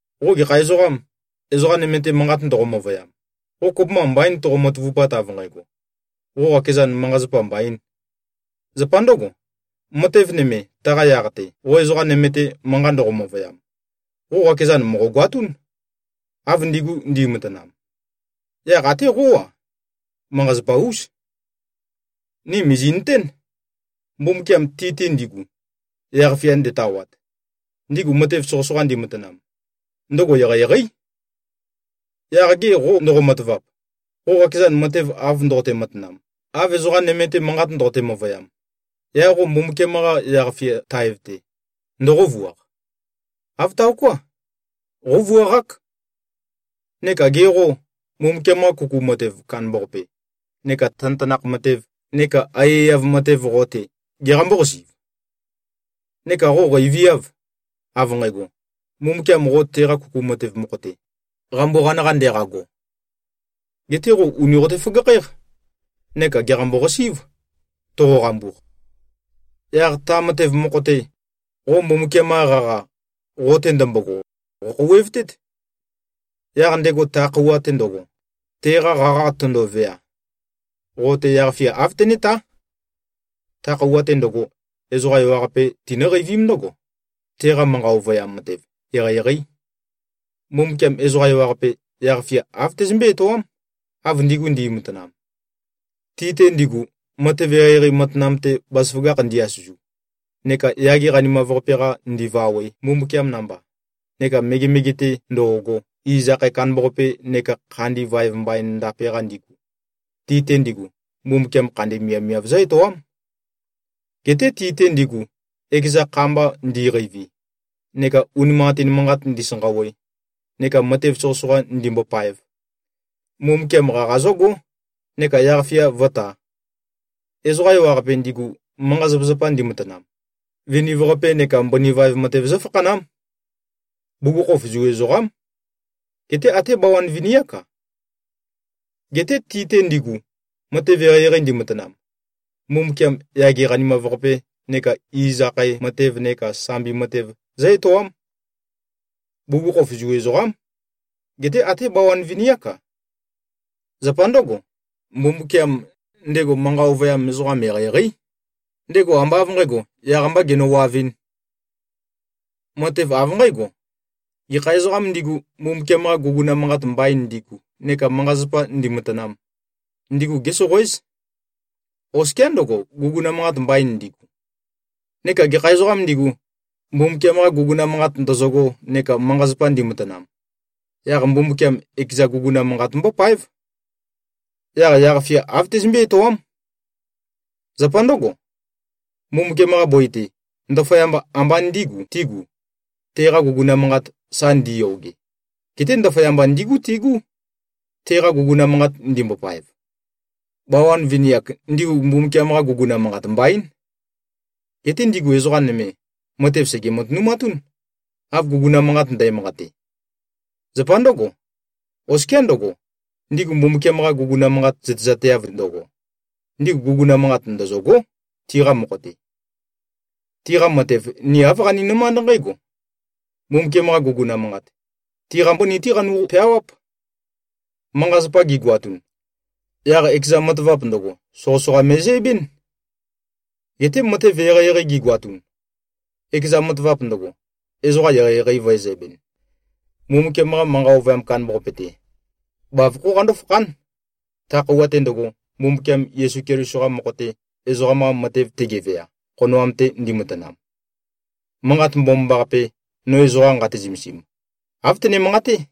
Qo gekha ezoqam, ezoqa nøme-te manqat ndoqo-møvøyam, qo kopømba mbaín toqo-matavupat, av nqægo, qo qakezan, manqa-zapa mbaīn. Zapa ndǿgo, matev nøme, taqa yaq-te, qo ezoqa nøme-te manqat ndoqo-møvøyam, qo qakezan mòqogoatún, av ndigu ndi꞉matanam. Yaq até qó-a, manqa-zapa-ús. Ni mìzi꞉nøtén, Mbumbukiam ti-te ndigu, yaq-fia ndetawat, ndigu matev soqøsoqa ndimatanam, ndøgo eqeieqeí. Yaq ge qô, ndoqo-matavap, qo qakezan matev av ndoqote-matanam, av ezoqa nøme-te manqat ndoqote-møvøyam, yaq qo Mbumbukiam-qa yaq-fia taev-te, ndoqóvuaq? Āv taoká. Qóvuaqák. Neka ge qô, Mbumbukiam-qa kuku matev kandambaqape neka tanøtanakh matev neka aiyaiyav matev qo-te, geqambó-qasi꞉v? Neka qo qeiviâv, av nqægo, Mbumbukiam qo teqa kuku matev mokho-te, qambuqan-qa ndeqago. Geté qo ùni qote-føgakhǽq neka gèqambo-qasí꞉v, toqoqambuq. Yaq ta matev mokho-te, qo Mbumbukiam-qa qaqa, qo-te ndømbogo, qòkhouwevtét. Yaq ndego, ta khøuwa-te ndøgo, teqa qaqa tøndovea, qo-te yaq-fia āv tenétá. Ta khøuwa-te ndøgo, ezoqa ewaqape tinǿqeivím ndǿgo, teqa manqa ovøyam matev eqeieqeí. Mbumbukiam ezoqa ewaqape, yaq-fia āv tezømbé-etoám, av ndigu ndi꞉matanam. Ti-te ndigu, matev eqeieqei matanam-te bazaføgakh ndi-asøzu, neka yage qanimav-qape-qa ndivawe, Mbumbukiam namba, neka megemege-te ndo꞉go, iz akhae kandambaqape neka khandi vaev mbain ndape-qa ndigu, ti-te ndigu, Mbumbukiam khandi miavmiav zǿ-etoám. Geté ti-te ndigu, ekeza kha mba ndi꞉qeivi neka unimanqatin manqat ndisanqawe neka matev soqøsoqa ndimbopaev, Mbumbukiam qaqa zǿgó neka yaq-fia vǿtā. Ezoqa ewaqape, ndigu manqa-zapazapa ndimatanam, viniv-qape neka mbøni vaev matev zǿfakhanám. Bugukhokhof Zu ezoqám. Geté até bawan vini-ák-a. Geté ti-te ndigu, matev eqeieqei ndimatanam, Mbumbukiam yage qanimav-qape neka iz akhae matev neka sambi matev zǿ-etoám. Bugukhokhof Zu ezoqám. Geté até bawan vini-ák-a. Zapa ndǿgo, Mbumbukiam, ndego manqa ovøyam ezoqam eqeieqeí. Ndego ambá av nqǣgo, yaq-mbā genøwavɨ̄n. Matev av nqǽgo: Gekha ezoqām ndigu, Mbumbukiam-qa guguna manqat mbain ndigu neka manqa-zapa ndimatanam, ndigu gésoqoéz, oskiá ndøgo, guguna manqat mbain ndigu. Neka gekha ezoqām ndigu, Mbumbukiam-qa guguna manqat ndøzøgo neka manqa-zapa ndimatanam, yaq Mbumbukiam ekeza guguna manqat mbópáev. Yaq yaq-fia āv tezømbé-etoám. Zapa ndǿgo, Mbumbukiam-qa bøi-te, ndaføyamba ambā ndígu tīgu, teqa guguna manqat sa ndiyoge. Geté ndaføyamba ndígu tigú, teqa guguna manqat ndimbopaev. Bawan vini-ak, ndigu Mbumbukiam-qa guguna manqat mbaín. Geté ndigu ezoqa nøme, matev sège-matønumatún, av guguna manqat ndæmanqate. Zapa ndǿgo, oskiá ndøgo, ndigu Mbumbukiam-qa guguna manqat zøtezateav ndøgo, ndigu guguna manqat ndøzø̂gó, tiqa mokho-te. Tiqa matev ni āv qaninømánd nqǽgo: Mbumbukiam-qa guguna manqat, tiqa mbøni-té qanu꞉-peawáp. Manqa-zapa gigoatun, yaq ekeza matavap ndøgo, soqøsoqa me꞉zæbɨ́n. Geté matev eqeieqei gigoatun, ekeza matavap ndøgo, ezoqa eqeieqei vø̄ezæbɨn. Mbumbukiam-qa manqa ovøyam kandambaqape-te, bavokhó qandó-fakhán, ta khøuwa-te ndøgo, Mbumbukiam Yesu Keliso-qa mokho-te, ezoqam-qa matev tegevea, khonoam-te ndimatanam. Manqat Mbomambaqape, no ezoqa nqate-zømesim, āv tøne-manqaté.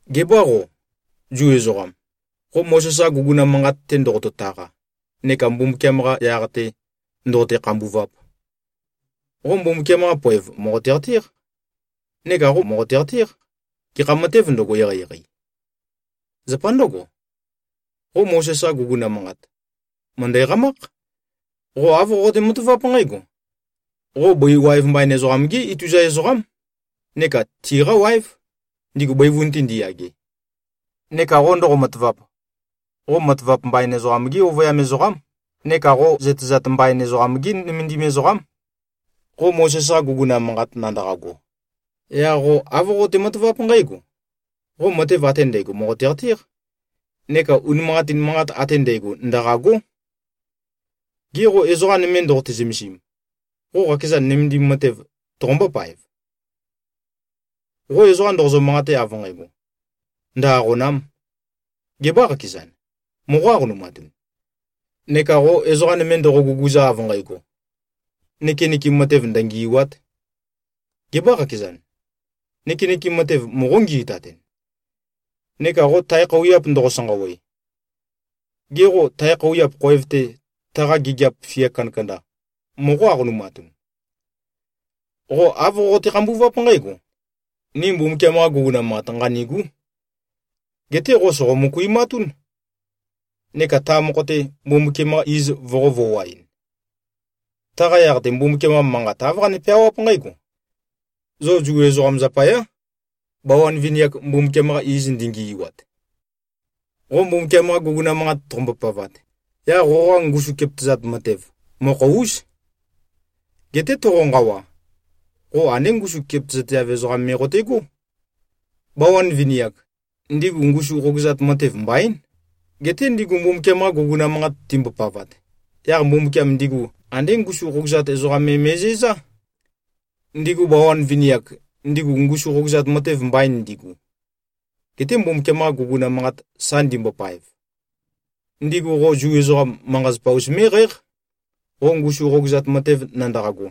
Gebâ qo, Zu ezoqam, qo Mozes-qa guguna manqat-te ndoqoto-taqa neka Mbumbukiam-qa yaq-te ndoqote-khambuvap? Qo Mbumbukiam-qa poev mòqote-qatéq, neka qo mòqote-qatéq, gekha matēv ndøgo, eqeieqei. Zapa ndǿgo, qo Mozes-qa guguna manqat, mø̀ndæ-qamákh. Qo āv qoqote-mataváp nqǽgo: Qo bøi waev mbain ezoqam-gí ituza ezoqám neka tiqá waév, ndigu bøivun-te ndiyage. Neka qo ndoqo-matavap, qo matavap mbain ezoqam-gí ovøyam ezoqám neka qo zøtezat mbain ezoqam-gí nømendim ezoqám. Qo Mozes-qa guguna manqat nandaqago, yaq qo āv qoqote-mataváp nqǽgo: Qo matev ate ndægo mòqote-qatéq neka unimanqatin manqat ate ndægo ndaqâgó. Ge qô, ezoqa nøme ndoqote-zømesim, qo qakeza nømendim matev toqombó-paev? Qo ezoqa ndoqozø-manqate av nqægo, “Ndø-aqòna᷄m,” gebâ qakezan, moqó-aqonumatun? Neka qo ezoqa nøme ndoqo-guguza av nqægo, “Nøkenøkem matev ndøngì꞉wa᷄t,” gebâ qakezan, nøkenøkem matev moqó-ngi꞉tatun? Neka qo tae khøuwiap ndoqo-sanqawe, gê, qo tae khøuwiap khoev-te, taqa gigiap fia kandakanda moqó-aqonumatun? Qo āv qoqote-khambuváp nqǽgo, “Ni Mbumbukiam-qa guguna manqat nqanîgú.” Geté qo sòqo-møkuimatún, neka ta mokho-te, Mbumbukiam-qa iz voqō-voaɨn. Taqa yaq-te, Mbumbukiam-qa Manqat āv qane-peawáp nqǽgo, “Zo Zu ezoqam zapayá, bawan vini-ak, Mbumbukiam-qa iz ndingi꞉wat.” Qo Mbumbukiam-qa guguna manqat toqombo-pavat, yaq qoqa ngusum kepøtøzat matev, mokho-ús. Geté toqonqawa, qo andé ngusum kepøtøzateav ezoqam me qote꞉gó. Bawan vini-ak, ndigu ngusu qogøzat matev mbaín. Geté ndigu Mbumbukiam-qa guguna manqat timbopavat, yaq Mbumbukiam ndigu andé ngusu qogøzat ezoqam me me꞉zæzá. Ndigu bawan vini-ak, ndigu ngusu qogøzat matev mbain ndigu, gete Mbumbukiam-qa guguna manqat sa ndimbopaev, ndigu qo Zu ezoqam, manqa-zapa-us mé꞉qǽq, qo ngusu qogøzat matev nandaqago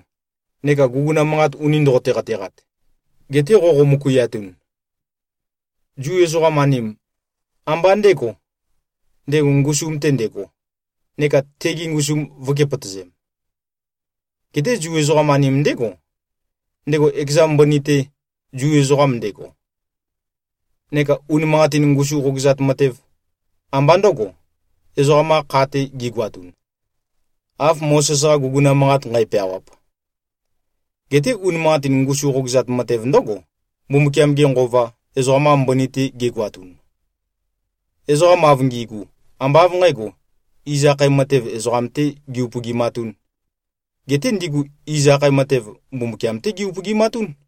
neka guguna manqat uni ndoqote-qateqat, gete qoqo-møkuiatun. Zu ezoqam-anim, ambá ndēgo, ndego ngusum-te ndego, neka tegi ngusum vø̄kepøtøzem. Geté Zu ezoqam-anim ndégo, ndego ekeza mbøni-te Zu ezoqam ndego. Neka unimanqatin ngusu qogøzat matev, ambá ndø̄go, ezoqam-qa kha-te gigoatun, av Mozes-qa guguna manqat nqæpeawap. Geté unimanqatin ngusu qogøzat matev ndǿgo, Mbumbukiam-ge Nqova, ezoqam-qa mbøni-te gegoatun. Ezoqam av ngi꞉gu, ambá av nqǣgo, iz akhae matev ezoqam-tē gi-upøgimatūn, geté ndigu iz akhae matev, Mbumbukiam-té gi-upøgimatún.